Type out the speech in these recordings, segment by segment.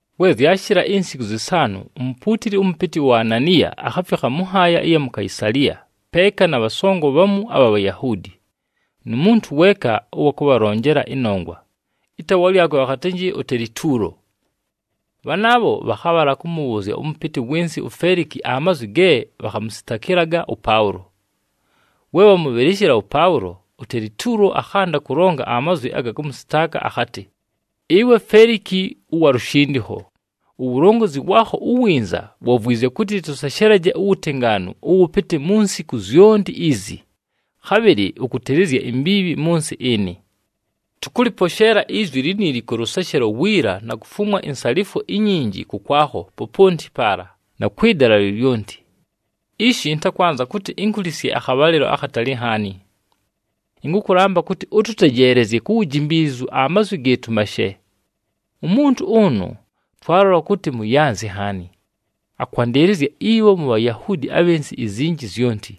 We zyashɨla insiku zɨsaanʉ, umupuutili ʉmʉpɨtɨ uAnaniya akhafikha mʉ nhaaya ɨya mu Kaisaliya peeka na bhasongo bhamu abha Bhayahuudi, nu muntu weeka ʉwa kʉbhalonjela ɨnongwa, ɨtaawa lyakwe bhakhatɨnjɨ uTelituulo. Bhanaabho bhakhabhala kʉmʉbhʉʉzya ʉmʉpɨtɨ wɨ nsɨ uFeliki amazwi ge bhakhamʉsɨtakɨlaga ʉPaʉlo. We bhamʉbhɨlɨshɨla ʉPaʉlo, uTelituulo akhanda kʉlonga amazwi aga kʉmʉsɨtaaka akhatɨ, “Ɨwe Feliki ʉwa lushindikho, uwulongozi waakho uwinza wavwizye kʉtɨ tʉseshelaje uwutengaanu ʉwʉpɨtɨ mu nsiku zyonti izi, khabhɨlɨ ʉkʉtɨlɨzya imbiibhi mʉ nsɨ ɨnɨ. Tʉkʉlɨposheela izwi liniili kʉ lʉseshelo wiila na kufumwa insalifwo inyinji kʉkwakho poponti paala, na kwɨ dala lyolyonti. Ishi ɨntakwanza kʉtɨ inkulisye akhabhalɨlo akhatali nhaani. Ɨnkʉkʉlamba kʉtɨ ʉtʉtejeelezye ku wujimbiilizu amazwi gɨɨtʉ mashe. “Umuntu ʉnʉ, twalola kʉtɨ muyanzi nhaani. Akwandɨlɨzya ibho mu Bhayahuudi abhɨ nsɨ izinji zyonti.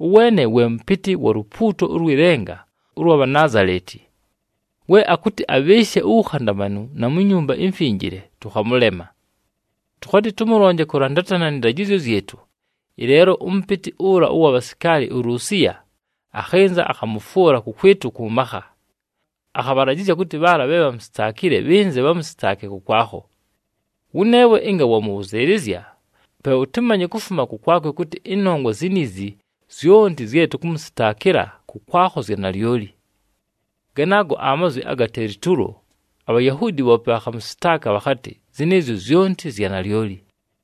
Ʉweene we mʉpɨtɨ wa lupuuto ʉlwɨ lenga ʉlwa Bhanaazaleti. We akʉtɨ abhɨɨshe uwukhandamanu na mu Nyumba iMfinjile, tʉkhamʉlema. [Tʉkhatɨ tʉmʉlonje kʉlandatana nɨ ndajɨzyo zyɨtʉ, ɨleelo ʉmʉpɨtɨ ʉla ʉwa bhasikaali uLusiya akhɨnza, akhamʉfwʉla kʉkwɨtʉ kʉ makha. Akhabhalajɨzya kʉtɨ bhaala bhe bhamusitaakile bhɨnze bhamʉsɨtaake kʉkwakho.] Wʉneewe ɨnga wamʉbhʉzɨɨlɨzya, pe ʉtɨmanye kufuma kʉkwakwe kʉtɨ ɨnongwa ziniizi zyonti zye tʉkʉmʉsɨtaakɨla kʉkwakho zya nalyoli.” Ganaago amazwi aga Telituulo, aBhayahuudi bhoope bhakhamʉsɨtaaka bhakhatɨ zɨnɨɨzyo zyonti zya nalyoli.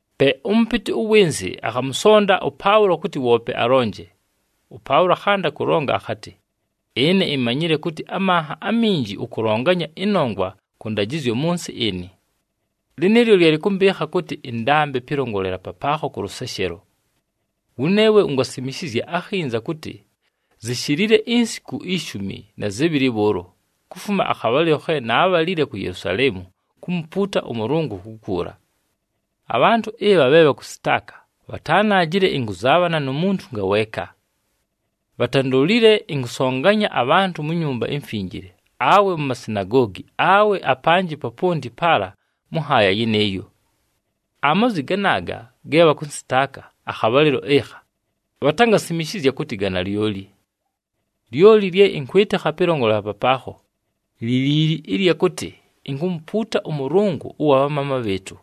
Pe ʉmʉpɨtɨ ʉwɨ nsɨ akhamʉsonda ʉPaʉlo kʉtɨ woope alonje. ɄPaʉlo akhanda kʉlonga akhatɨ, “Ɨne imanyile kʉtɨ amanha aminji ʉkʉlonganya ɨnongwa kʉ ndajɨzyo mʉ nsɨ ɨnɨ. Lɨnɨɨlyo lye lɨkʉmbɨɨkha kʉtɨ ɨndambe pɨlongolela papaakho kʉ lʉseshelo. Wʉneewe ungasimishizya akhinza kʉtɨ zishilile insiku ishumi na zɨbhɨlɨ bhʉʉlo, kufuma akhabhalɨlo khe naabhalile ku Yelusaleemu kumupuuta ʉMʉlʉngʉ kukuula. Abhantʉ ɨbha bhe bhakʉsɨtaaka bhatanaajile ɨnkʉzaabhana nu muntu ngaweeka. Bhatandolile ɨnkʉbhasonganya abhantʉ mu Nyumba iMfinjile, awe mu masinagoogi, awe apanjɨ poponti paala mʉ nhaaya yɨnɨɨyo. Amazwi ganaaga ge bhakʉnsɨtaaka akhabhalɨlo ɨkha, bhatangasimishizya kʉtɨ ga nalyoli. “Lyoli lye ɨnkwɨtɨkha pɨlongolela papaakho, li liili ɨlya kʉtɨ inkumupuuta ʉMʉlʉngʉ ʉwa bhamaama bhɨɨtʉ,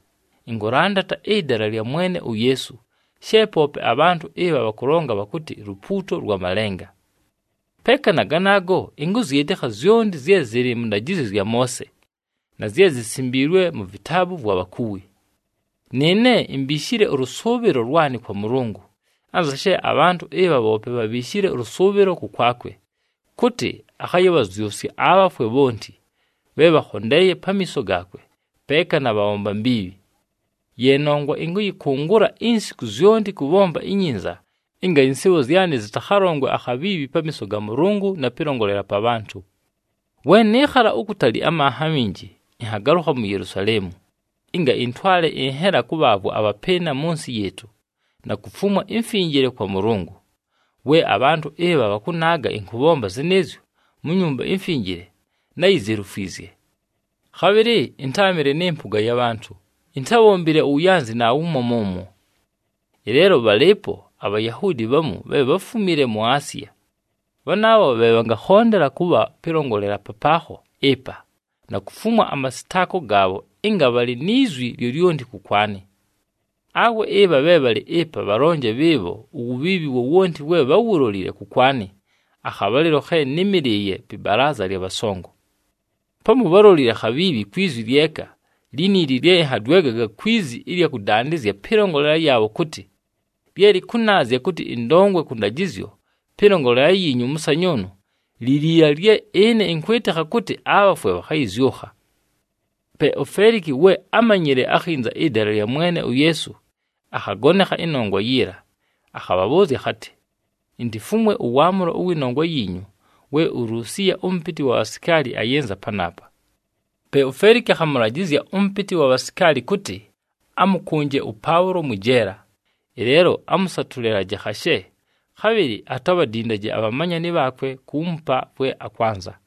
ɨnkʉlandata ɨDala lya Mwene uYeesu she poope abhantʉ ɨbha bhakʉlonga bhakʉtɨ lupuuto lwa malenga. Peeka na ganaago, ɨnkʉzyɨtɨkha zyonti zye zɨlɨ mʉ ndajɨzyo zya Moose, na zye zisimbiilwe mu vitaabu vwa bhakuwi. Nɨɨne imbiishile ʉlʉsʉʉbhɨlo lwanɨ kwa Mʉlʉngʉ, anza she abhantʉ ɨbha bhoope bhabhiishile ʉlʉsʉʉbhɨlo kʉkwakwe, kʉtɨ akhayɨbhazyʉsya abhafwe bhonti, bhe bhakhondeeye pamiiso gaakwe, peeka na bhabhomba mbiibhi. Ye nongwa ɨnkʉyɨkʉngʉla insiku zyonti kʉbhomba inyinza ɨnga ɨnsɨɨbho zyanɨ zɨtakhalongwe akhabhiibhi pamiiso ga Mʉlʉngʉ na pɨlongolela pa bhantʉ. “We nɨɨkhala ukutali amanha aminji, ɨnhagalʉkha mu Yelusaleemu, ɨnga ɨntwale ɨnhela kʉbhaavwa abhapɨɨna mʉ nsɨ yɨɨtʉ, na kufumwa imfinjile kwa Mʉlʉngʉ. We abhantʉ ɨbha bhakʉnaaga ɨnkʉbhomba zɨnɨɨzyo mu Nyumba iMfinjile, náyizelufwizye. Khabhɨlɨ ɨntáamɨle nɨ mpʉga ya bhantʉ, intábhombile uwuyanzi naawumo mʉmwo. Ɨleelo bhalɨɨpo aBhayahuudi bhamu bhe bháfumile mu Asiya, bhanaabho bhe bhangakhondela kʉbha pɨlongolela papaakho ɨpa, na kufumwa amasɨtaako gaabho ɨnga bhalɨ ni zwi lyolyonti kʉkwanɨ. Awe ɨbha bhe bhalɨ ɨpa bhalonje bhɨɨbho uwubhiibhi wowonti we bháwulolile kʉkwanɨ akhabhalɨlo khe nɨ́mɨlɨɨye pɨ balaaza lya bhasongo. Pamu bhálolile khabhiibhi kwi zwi lyeka liniili lye ɨnhadwegaga kwi zi ɨlya kʉdandɨzya pɨlongolela yaabho kʉtɨ, ‘Lye lɨkʉnaazya kʉtɨ ɨndongwe kʉ ndajɨzyo pɨlongolela yiinyu ʉmʉsanyʉʉnʉ, li liila lye ɨne ɨnkwɨtɨkha kʉtɨ abhafwe bhakhayɨzyʉkha.’” Pe uFeliki, we ámanyile akhinza ɨDala lya Mwene uYeesu, akhagonekha ɨnongwa yiila. Akhabhabhʉʉzya akhatɨ, “Intifumwe ʉwaamʉlo wɨ nongwa yiinyu we uLusiya ʉmʉpɨtɨ wa bhasikaali ayɨnza panaapa.” Pe uFeliki akhamʉlajɨzya ʉmʉpɨtɨ wa bhasikaali kʉtɨ amʉkʉnje ʉPaʉlo mwɨ jeela, ɨleelo amʉsatʉlɨlaje khashe, khabhɨlɨ atabhadindaje abhamanyani bhaakwe kuumupa vwe akwanza.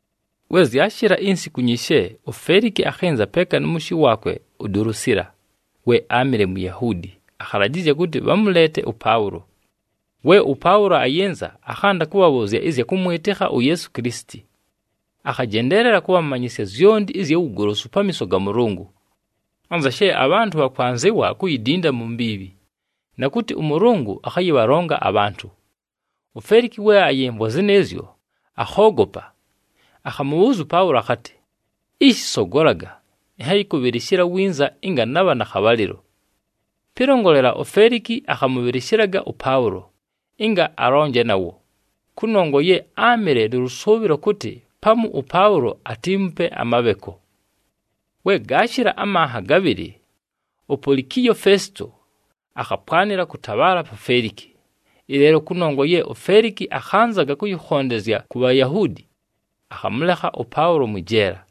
We zyashɨla insiku nyishe, uFeliki akhɨnza peeka nʉ mʉshɨ waakwe uDulusiila, we áamɨle Muyahuudi, akhalajɨzya kʉtɨ bhamʉleete ʉPaʉlo. We ʉPaʉlo ayɨnza, akhanda kʉbhabhʉʉzya ɨzya kʉmwɨtɨkha uYeesu Kilisiti. Akhajendeelela kʉbhamanyɨsya zyonti ɨzya wugolosu pamiiso ga Mʉlʉngʉ, anza she abhantʉ bhakwanzɨwa kuyidinda mu mbiibhi, na kʉtɨ ʉMʉlʉngʉ akhayɨbhalonga abhantʉ. UFeliki we ayɨmvwa zɨnɨɨzyo, akhoogopa. Akhamʉbhʉʉzya ʉPaʉlo akhatɨ, “Ishi sogolaga, ɨnhayɨkʉbhɨlɨshɨla winza ɨnga nabha na khabhalɨlo.” Pɨlongolela, uFeliki akhamʉbhɨlɨshɨlaga ʉPaʉlo, ɨnga alongaje nawo, kʉnongwa ye áamɨle nʉ lʉsʉʉbhɨlo kʉtɨ pamu ʉPaʉlo atiimupe amabheko. We gaashɨla amanha gabhɨlɨ, uPolikiyo Fesito akhapwanɨla kʉtabhaala pa Feliki. Ɨleelo kʉnongwa ye uFeliki akhanzaga kʉyɨkhondezya ku Bhayahuudi, akhamʉlekha ʉPaʉlo mwɨ jeela.